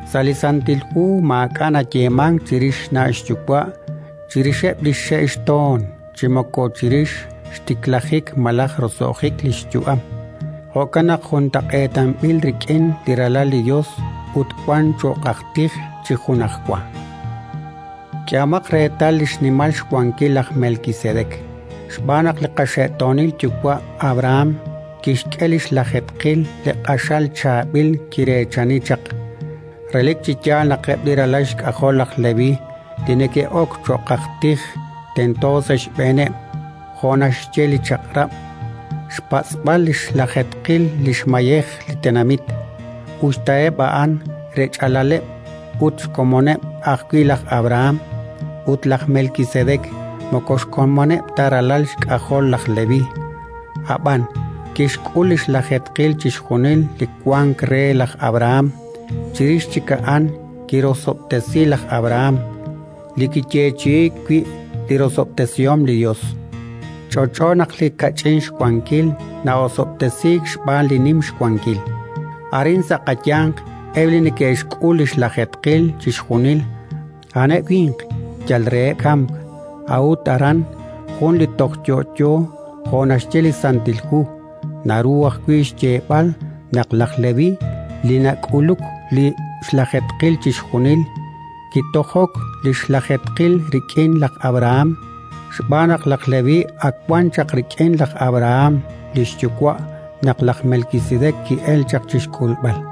Sa' li Santil Hu maak'a' nayeemank chirix xna' xyuwa', chirixeb' li xxe' xtoon chi moko chirix xtiklajik malaj roso'jik li xyu'am; jo'kan naq juntaq'eetanb'il rik'in li Ralal li Yos, ut wank cho'q aj tij chi junajwa. K'ehomaq reetal li xnimal xwankil laj Melkisedek, xb'aan naq li qaxe'toonil yuwa' Abrahán kixk'e li xlajeetqil li q'axal chaab'il kireechani chaq. Relik chi yaal naq eb' li ralal xk'ajol laj Leví li neke'ok cho'q aj tij tento sa' xb'eeneb', jo' naxye li Chaq'rab', xpatz'b'al li xlajeetqil li xmayej li tenamit, us ta eb' a'an rech'alaleb' ut xkomoneb' ajwi' laj Abrahán. Ut laj Melkisedek moko xkomoneb' ta li ralal xk'ajol laj Leví, ab'an kixk'ul li xlajeetqil chixjunil li wank re laj Abrahán; chirix chik a'an kirosob'tesi laj Abrahán, li kiyeechi'iik wi' li rosob'tesihom li Yos. Ch'olch'o naq li kach'in xwankil na'osob'tesiik xb'aan li nim xwankil. Arin, sa' qayanq, eb' li neke'xk'ul li xlajeetqil chixjunil, a'aneb' winq yal reheb' kamk; a'ut aran jun li toj yo'yo, jo' naxye li Santil Hu. Naru ajwi' xyeeb'al naq laj Leví, li nak'uluk li xlajeetqil chixjunil, kitojok li xlajeetqil rik'in laj Abrahán, xb'aan naq laj Leví ak wan chaq rik'in laj Abrahán li xyuwa' naq laj Melkisedek ki'elk chaq chi xk'ulb'al.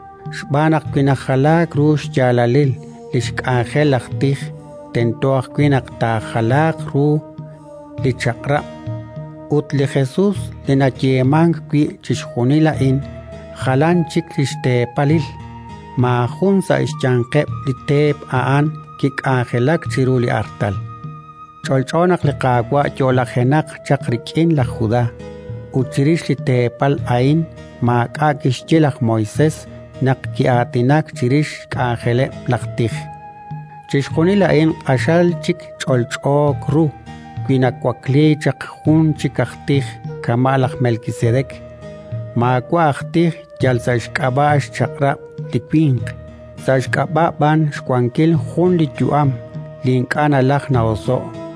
Xb'aan naq wi najalaak ru xyaalalil li xk'anjel laj tij, tento ajwi' naq taajalaaq ru li Chaq'rab'. Ut li Jesus, li nayeemank wi' chixjunil a'in, jalan chik xteepalil: maajun sa' xyanqeb' li teep a'an kik'anjelak chiru li artal. Ch'olch'o naq li Qaawa' yo'lajenaq chaq rik'in laj Judá; ut chirix li teepal a'in maak'a' kixye laj Moisés naq ki'aatinak chirix xk'anjeleb' laj tij. Chixjunil a'in q'axal chik ch'olch'o ru wi nawakliik chaq jun chik aj tij kama' laj Melkisedek, maawa' aj tij yal sa' xk'ab'a' xchaq'rab' li winq, sa' xk'ab'a' b'an xwankil jun li yu'am li ink'a' nalajk na'oso'k.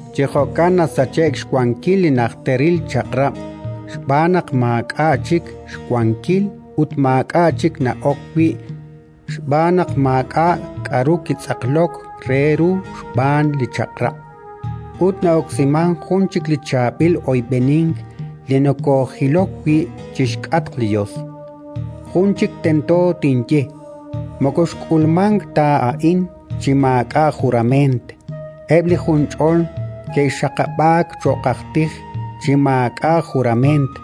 Chi jo'kan nasache'k xwankil li najteril chaq'rab' xb'aan naq maak'a' chik xwankil ut maak'a' chik na'ok wi' (xb'aan naq maak'a' k'aru kitz'aqlok re ru xb'aan li Chaq'rab'), ut na'oksimank jun chik chaab'il oyb'enink li nokoojilok wi' chi xk'atq li Yos. Jun chik tento tinye. Moko xk'ulmank ta a'in chi maak'a' jurament. Eb' li junch'ol ke'xaqab'aak cho'q aj tij chi maak'a' jurament,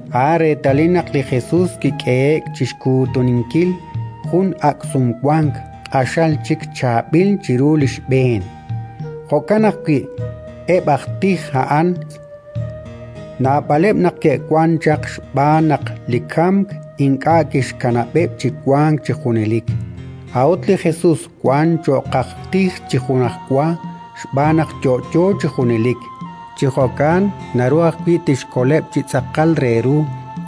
A'an reetalil naq li Jesus kik'ehe'k chi xkuutunkil jun ak' Sumwank, q'axal chik chaab'il chiru li xb'een. Jo'kan ajwi' eb' aj tij a'an, naab'aleb' naq ke'wank chaq xb'aan naq li kamk ink'a' kixkanab'eb' chi wank chi junelik. A'ut li Jesus wank cho'q aj tij chi junajwa xb'aan naq yo'yo chi junelik. Chi jo'kan naru ajwi' tixkoleb' chi tz'aqal re ru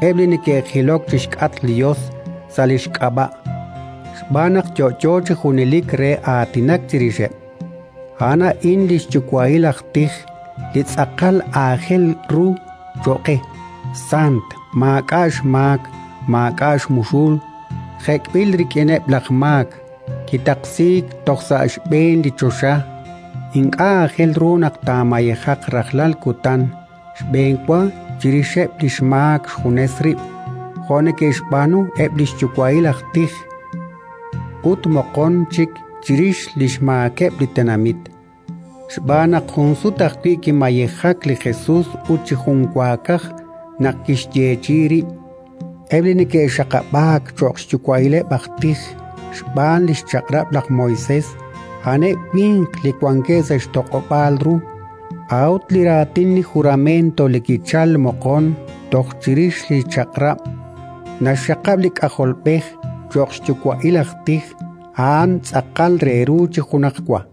eb' li neke'jilok chi xk'atq li Yos sa' li xk'ab'a', xb'aan naq yo'yo chi junelik re aatinak chirixeb'. A'an a'in li xyuwa'il aj tij li tz'aqal aajel ru cho'q qe: sant, maak'a' xmaak, maak'a' xmuxul, jek'b'il rik'ineb' laj maak, kitaqsiik toj sa xb'een li choxa. Ink'a' aajel ru naq taamayejaq rajlal kutan xb'enwa chirixeb' li xmaak xjunes rib' jo' neke'xb'aanu eb' li xyuwa'il aj tij, ut moqon chik chirix li xmaakeb' li tenamit. Xb'aan naq jun sut ajwi' kimayejak li Jesus ut chi junwaakaj, naq kixyeechi'i rib'. Eb' li neke'xaqab'aak cho'q xyuwa'ileb' aj tij xb'aan li xChaq'rab' laj Moisés a'aneb' winq li wankeb' sa' xtoq'ob'aal ru; a'ut li raatin li jurament li kichalk moqon toj chirix li Chaq'rab', naxxaqab' li K'ajolb'ej cho'q xyuwa'il aj tij, a'an tz'aqal re ru chi junajwa.